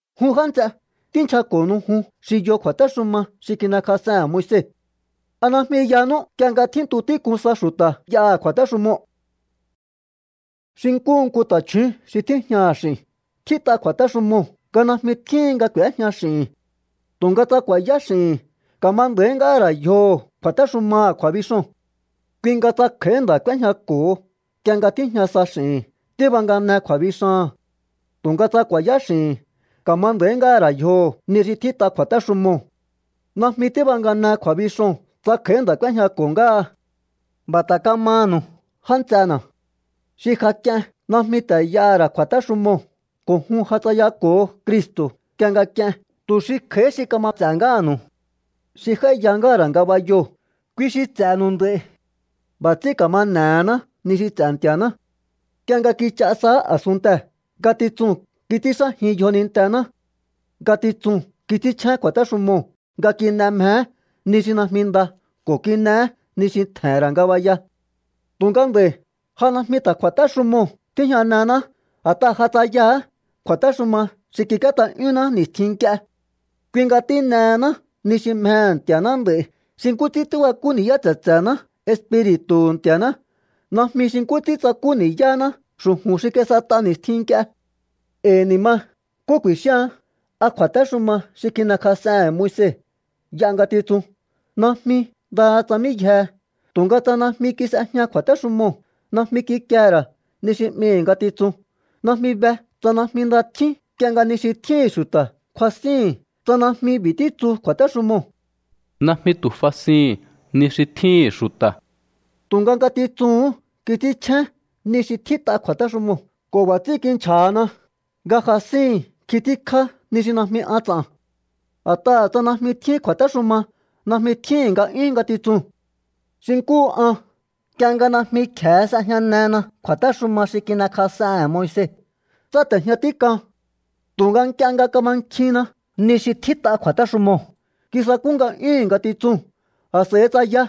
Jun já nts'e, tínchjako̱nu̱u jun xi yo kju̱a̱téxuma xi kin'ekjas'ehe̱n Moise. ¿A najmi yanú nk'ie nga tjíntu tík'un sa xu̱ta̱ y'aha̱ kju̱a̱téxumoo̱? Xi nkúhu nku ta̱chju̱ún xi tíjñaha̱ x'i̱n, tjít'a kju̱a̱téxumoo̱ nga najmi tjíhin nga k'u̱éjña x'i̱hi̱n. Tu̱nga tsa ku̱a̱yá x'i̱hi̱n, ka̱ma nda̱í ngáha̱ ra̱ yjoho̱ kju̱a̱téxumaha̱ kju̱a̱bixoo̱n. Kui nga tsa kj'a̱í nda̱ k'úéjñako̱ho nk'ie nga tíjña sa x'i̱hi̱n, tíbangane kju̱a̱bixaha̱n. Tu̱nga tsa ku̱a̱yá x'i̱hi̱n, ka̱ma nda̱í ngáha̱ ra̱ yjoho̱ ni xi tjít'a kju̱a̱téxumoo̱. Najmi tíbangane kju̱a̱bixoo̱n tsa kj'a̱í nda̱ k'úéjñako̱ ngáha. B'a̱ ta̱ kamanu̱u, já nts'ena̱. Xi ja k'ien najmi ta̱ y'aha̱ ra̱ kju̱a̱téxumoo̱, ko̱ jun ja tsayako̱o Cristo̱ nk'ie nga k'ien tu̱ xi kj'a̱í xi kama ts'e̱ ngáha̱nu̱u. Xi j'áíya ngáha̱ ra̱ ngabayoo̱, kui xi ts'e̱nu̱u nd'a̱i̱. B'a̱ ts'ín ka̱ma n'e̱hená ni xi ts'e̱ Nti̱a̱ná. Nk'ie nga kich'a saá a̱sunntee̱, ngatitsuu̱n kits'ínxájin yjonintená. Ngatitsuu̱n kits'ínchjén kju̱a̱téxumoo̱ nga kin'e mjeé ni xi najmi nda, ko̱ kin'eé ni xi tje̱he̱n ra̱ ngabaya. Tu̱nga nd'a̱i̱ ja najmi ta̱ kju̱a̱téxumoo̱ tíjñanehená, a̱t'aha̱ ja tsayaha̱á kju̱a̱téxuma xi kik'íét'a'yúnná ni̱stjin nk'ie. Kui nga tín'ehená ni xi mjehe̱ Nti̱a̱ná nd'a̱i̱ xi nkú ts'ín tíbakú ni̱yá tse̱tse̱ná Espiri̱tu̱hu̱ Nti̱a̱ná, najmi xi nkú ts'ín tsakú ni̱yáná xu̱ju̱n xi kis'et'a ni̱stjin nk'ie. E̱i̱ ni̱ ma, ¿nkú ku̱i̱xíaán? ¿A kju̱a̱téxuma xi kin'ekjas'ehe̱n Moise y'a ngatitsun? ¡Najmi! ¡Ndaha tsa mí yjehe! Tu̱nga tsa najmi kis'ejña kju̱a̱téxumoo̱, najmi kikie ra̱ ni xi 'mihi̱ ngatitsun. Najmi be tsa najmi nda tjín nk'ie nga ni xi tjíhi̱n xu̱ta̱ kjuasíhi̱n tsa najmi b'i̱ títsu kju̱a̱téxumoo̱: “Najmi tu̱ fasihi̱n ni xi tjíhi̱n xu̱ta̱.” Tu̱nga ngatitsuu̱hún kits'ínchjén ni xi tjít'a kju̱a̱téxumoo̱ ko̱ b'a̱ ts'ín kinchja̱hana nga jasíhi̱n nkjin tíkjá ni xi najmi an ts'a̱n. A̱t'aha̱ tsa najmi tjín kju̱a̱téxuma, najmi tjíhi̱n nga'yún ngatitsuu̱n. Xi nkúhu an. Nk'ie nga najmi kje̱e s'ejñanena kju̱a̱téxuma xi kin'ekjas'ehe̱n Moise, tsáte̱jña tík'an. Tu̱nga nk'ie nga kamankjinna ni xi tjít'a kju̱a̱téxumoo̱, kisakú nga'yúhu̱n ngatitsuu̱n, a̱s'a̱i tsaya.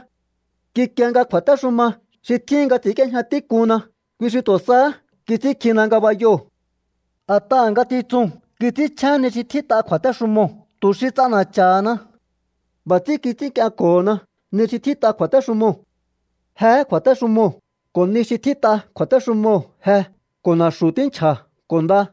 Kikie nga kju̱a̱téxuma xi tjíhin nga ts'i̱ínk'íéjña tík'unna, kui xi tu̱ sahá kits'ínkjina ngabayoo̱. A̱t'aha̱ ngatitsuu̱n kits'ínchjén ni xi tjít'a kju̱a̱téxumoo̱ tu̱ xi ts'ana̱cha̱hana. B'a̱ ts'ín kits'ínk'ienko̱hona ni xi tjít'a kju̱a̱téxumoo̱. Jehé kju̱a̱téxumoo̱, ko̱ ni xi tjít'a kju̱a̱téxumoo̱ je ko̱ na̱xu̱ tínchja̱ ko̱ nda.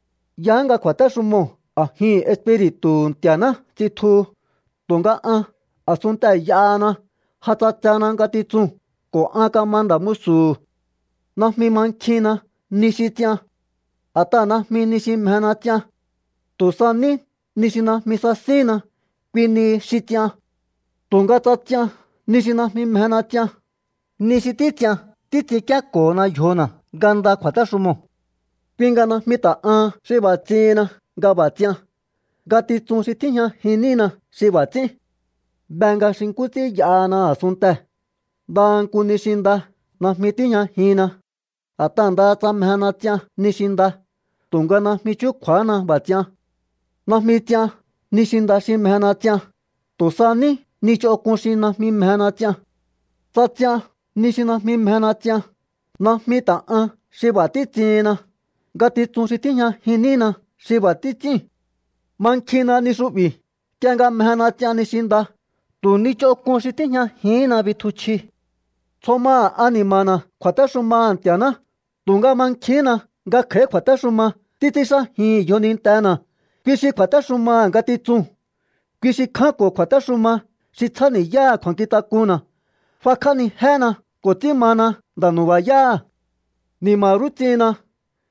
Yaá nga kju̱a̱téxumoo̱ a̱jihi̱n Espiri̱tu̱hu̱ Nti̱a̱ná tsitjuhu, tu̱nga an a̱sunntee̱ y'ahana. Ja ts'atsena ngatitsuu̱n ko̱ an kama nda̱ musu̱hu̱. Najmi mankjinna ni xi ts'ian. A̱t'aha̱ najmi ni xi mjena ts'ian. Tu̱ sa ní ni xi najmi sasínna, kui nihi xi ts'ian. Tu̱nga tsa ts'ian ni xi najmi mjena ts'ian, ni xi títs'ian títs'inkíéko̱hona yjona̱ nga nda kju̱a̱téxumoo̱. Kui nga najmi ta̱ an xi b'a̱ ts'ihinna nga b'a̱ ts'ian. Ngatitsun xi tíjñajin nína xi b'a̱ ts'ín. Be nga xi nkú ts'ín y'ahana a̱sunntee̱, ndaha nku ni xi nda najmi tíjñajinna. A̱t'aha̱ ndaha tsa mjena ts'ian ni xi nda, tu̱nga najmi chúkju̱a̱hána b'a̱ ts'ian. Najmi ts'ian ni xi nda xi mjena ts'ian, tu̱ sa ní ni ch'onk'un xi najmi mjena ts'ian. Tsa ts'ian ni xi najmi mjena ts'ian, najmi ta̱ an xi b'a̱ títs'ihinna. Ngatitsun xi tíjñajin nína xi b'a̱ títs'íu̱n. Mankjinna ni xu'bi̱. Nk'ie nga mjena ts'ian ni xi nda, tu̱ ni ch'onk'un xi tíjñajihínna bitjuchji. Tsjo maha̱ ani̱ma̱na̱ kju̱a̱téxumaha̱ Nti̱a̱ná, tu̱nga mankjihínna nga kj'a̱í kju̱a̱téxuma títs'ínxájin yjonintena̱, kui xi kju̱a̱téxumaha̱ ngatitsuu̱n. Kui xi kjánko̱ kju̱a̱téxuma xi tsjáni̱yáha̱ kju̱a̱nkjintak'unna̱. F'akj'ánijéna ko̱ ts'ín mana nda̱ nu̱ba̱yáha̱. ¡Ni̱ma̱ rú ts'ihinna!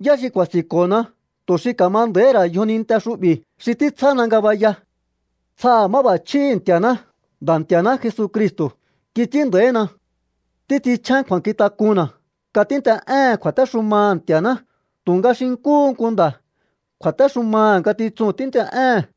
¿Yá xi ku̱a̱si̱nko̱na tu̱ xi ka̱ma nda̱íhi̱ ra̱ yjoninte xu'bi̱ xi títsjána ngabaya? ¡Tsjaha̱ máb'a̱chjíhi̱ Nti̱a̱ná! Nda̱ Nti̱a̱ná Jesucristo̱ kits'ín nda̱ína. Títs'inchjén kju̱a̱nkjintak'unna̱ nga tínt'e'éhe̱n kju̱a̱téxumaha̱ Nti̱a̱ná, tu̱nga xi nkúhu nku nda̱, kju̱a̱téxumaha̱ ngatitsuu̱n tínt'e'éhe̱n.